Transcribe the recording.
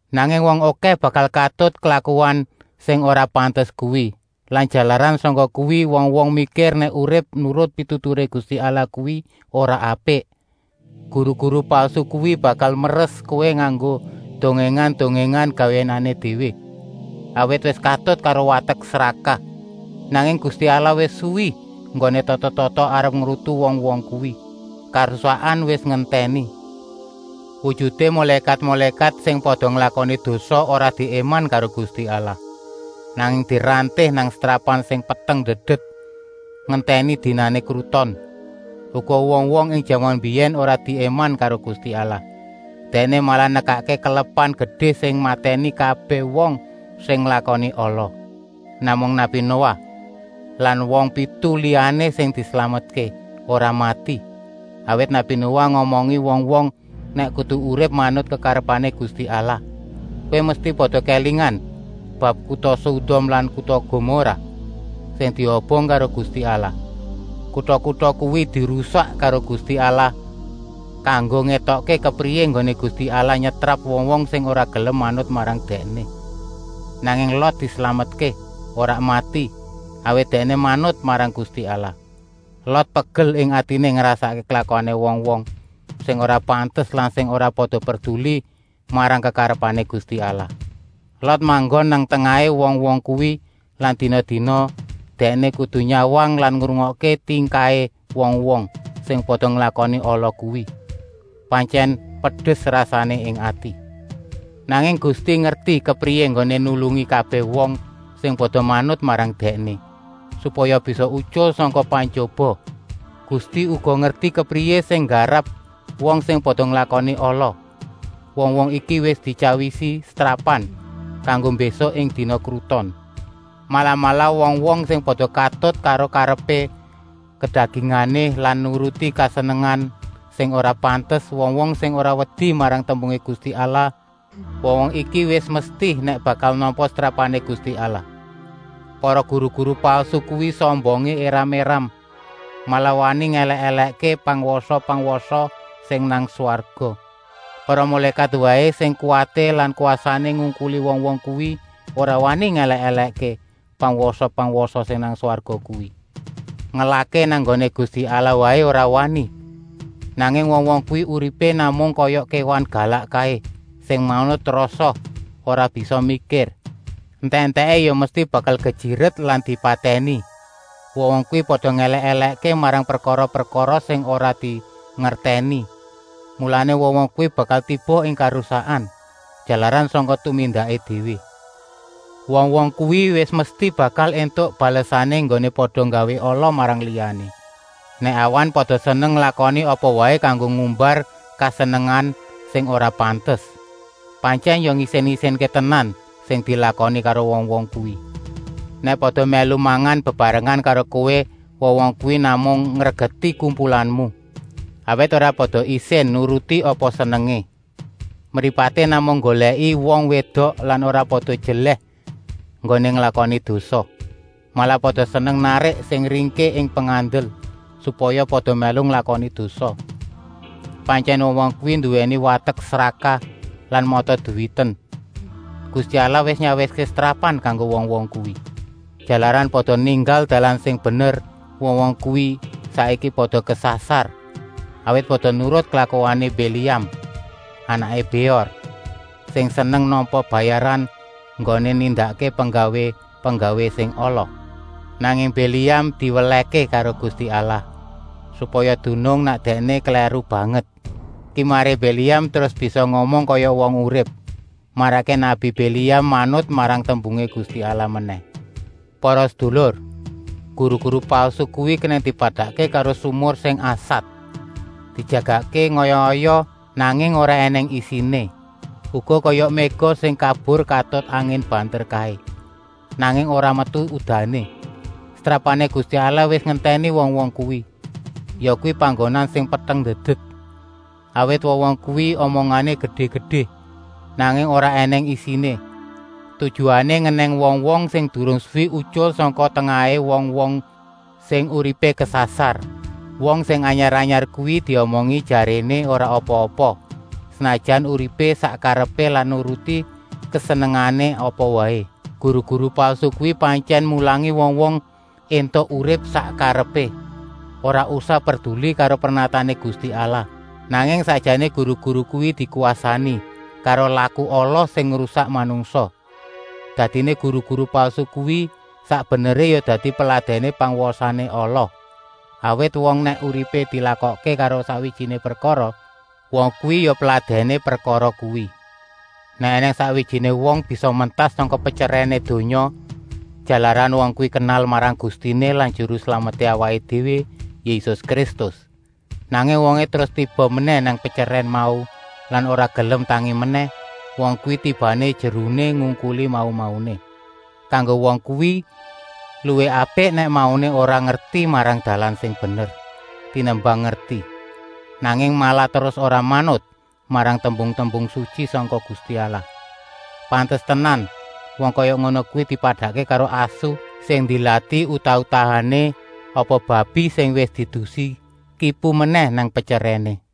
Nanging wong okèh bakal katut karo klakuan sing ora pantes kuwi lan jalaran sangka kuwi wong-wong mikir nèk urip nurut pituturé Gusti Allah kuwi ora apik. Guru-guru palsu kuwi bakal meres kowé nganggo dongèngan-dongèngan gawéané déwé, awit wis katut karo watek srakah. Nanging Gusti Allah wis suwi enggoné tata-tata arep ngrutu wong-wong kuwi. Karusakan wis ngentèni. Wujuté mulékat-mulékat sing pada nglakoni dosa ora diéman karo Gusti Allah, nanging diranté nang setrapan sing peteng ndedet, ngentèni dinané kruton. Uga wong-wong ing jaman mbiyèn ora diéman karo Gusti Allah, Dèkné malah nekakké kelepan gedé sing matèni kabèh wong sing nglakoni ala. Namung nabi Noah lan wong pitu liyané sing dislametké, ora mati, awit nabi Noah ngomongi wong-wong nèk kudu urip manut kekarepané Gusti Allah. Kowé mesti pada kélingan bab kuta Sodom lan kuta Gomorah, sing diobong karo Gusti Allah. Kuta-kuta kuwi dirusak karo Gusti Allah kanggo ngétokké kepriyé enggoné Gusti Allah nyetrap wong-wong sing ora gelem manut marang Dèkné. Nanging Lot dislametké, ora mati, awit dèkné manut marang Gusti Allah. Lot pegel ing atiné ngrasakké klakuané wong-wong sing ora pantes lan sing ora pada perduli marang kekarepané Gusti Allah. Lot manggon nang tengahé wong-wong kuwi lan dina-dina dèkné kudu nyawang lan ngrungokké tingkahé wong-wong sing pada nglakoni ala kuwi. Pantyèn pedes rasané ing ati. Nanging Gusti ngerti kepriyé enggoné nulungi kabèh wong sing pada manut marang Dèkné, supaya bisa utyul sangka pantyoba. Gusti uga ngerti kepriyé sing nggarap wong sing pada nglakoni ala. Wong-wong iki wis dityawisi setrapan kanggo mbésuk ing dina kruton. Malah-malah wong-wong sing pada katut karo karepé kedagingané lan nuruti kesenengan sing ora pantes, wong-wong sing ora wedi marang tembungé Gusti Allah, wong-wong iki wis mesti nèk bakal nampa setrapané Gusti Allah. Para guru-guru palsu kuwi sombongé éram-éram, malah wani ngèlèk-èlèkké pangwasa-pangwasa sing nang swarga. Para mulékat waé, sing kuwaté lan kwasané ngungkuli wong-wong kuwi, ora wani ngèlèk-èlèkké pangwasa-pangwasa sing nang swarga kuwi. Ngelahké nang nggoné Gusti Allah waé ora wani. Nanging wong-wong kuwi uripé namung kaya kéwan galak kaé sing manut rasa, ora bisa mikir. Entèk-entèké ya mesti bakal kejiret lan dipatèni. Wong-wong kuwi pada ngèlèk-èlèkké marang prekara-prekara sing ora dingertèni. Mulané wong-wong kuwi bakal tiba ing karusakan, jalaran sangka tumindaké déwé. Wong-wong kuwi wis mesti bakal éntuk balesané enggoné pada nggawé ala marang liyané. Nèk awan pada seneng nglakoni apa waé kanggo ngumbar kesenengan sing ora pantes. Pantyèn ya ngisin-isinké tenan sing dilakoni karo wong-wong kuwi. Nèk pada mèlu mangan bebarengan karo kowé wong-wong kuwi namung ngregeti kumpulanmu, awit ora pada isin nuruti apa senengé. Mripaté namung nggolèki wong wédok lan ora pada jelèh enggoné nglakoni dosa. Malah pada seneng narik sing ringkih ing pengandel, supaya pada mèlu nglakoni dosa. Pantyèn wong-wong kuwi nduwèni watek srakah lan mata-duwiten. Gusti Allah wis nyawiské setrapan kanggo wong-wong kuwi. Jalaran pada ninggal dalan sing bener wong-wong kuwi saiki pada kesasar, awit pada nurut klakuané Biléam, anaké Béor, sing seneng nampa bayaran enggoné nindakké penggawé-penggawé sing ala. Nanging Biléam diwelèhké karo Gusti Allah, supaya dunung nèk dèkné klèru banget. Kimaré Biléam terus bisa ngomong kaya wong urip, marakké nabi Biléam manut marang tembungé Gusti Allah menèh. Para sedulur, guru-guru palsu kuwi kenèng dipadakké karo sumur sing asat, dijagakké ngaya-ngaya, nanging ora ènèng isiné. Uga kaya méga sing kabur katut angin banter kaé, nanging ora metu udané. Setrapané Gusti Allah wis ngentèni wong-wong kuwi, yakuwi panggonan sing peteng ndedet. Awit wong-wong kuwi omongané gedé-gedé, nanging ora ènèng isiné, tujuané ngenèng wong-wong sing durung suwi utyul sangka tengahé wong-wong sing uripé kesasar. Wong sing anyar-anyar kuwi diomongi jaréné ora apa-apa, senajan uripé sak karepé lan nuruti kesenengané apa waé. Guru-guru palsu kuwi pantyèn mulangi wong-wong éntuk urip sak karepé, ora usah perduli karo pernatané Gusti Allah, nanging sakjané guru-guru kuwi déwé dikwasani karo laku ala sing ngrusak manungsa. Dadiné guru-guru palsu kuwi sak beneré ya dadi peladèné pangwasané ala, awit wong nèk uripé dilakokké karo sakwijiné prekara, wong kuwi ya peladèné prekara kuwi. Nèk ènèng sakwijiné wong bisa mentas sangka petyerèné donya jalaran wong kuwi kenal marang Gustiné lan Juru Slameté awaké déwé Yésus Kristus, nanging wongé terus tiba menèh nang petyerèn mau lan ora gelem tangi menèh, wong kuwi tibané jeruné ngungkuli mau-mauné. Kanggo wong kuwi luwih apik nèk mauné ora ngerti marang dalan sing bener, tenimbang ngerti, nanging malah terus ora manut marang tembung-tembung sutyi sangka Gusti Allah. Pantes tenan wong kaya ngono kuwi dipadakké karo asu sing ndilati utah-utahané apa babi sing wis diedusi kipu menèh nang petyerèné.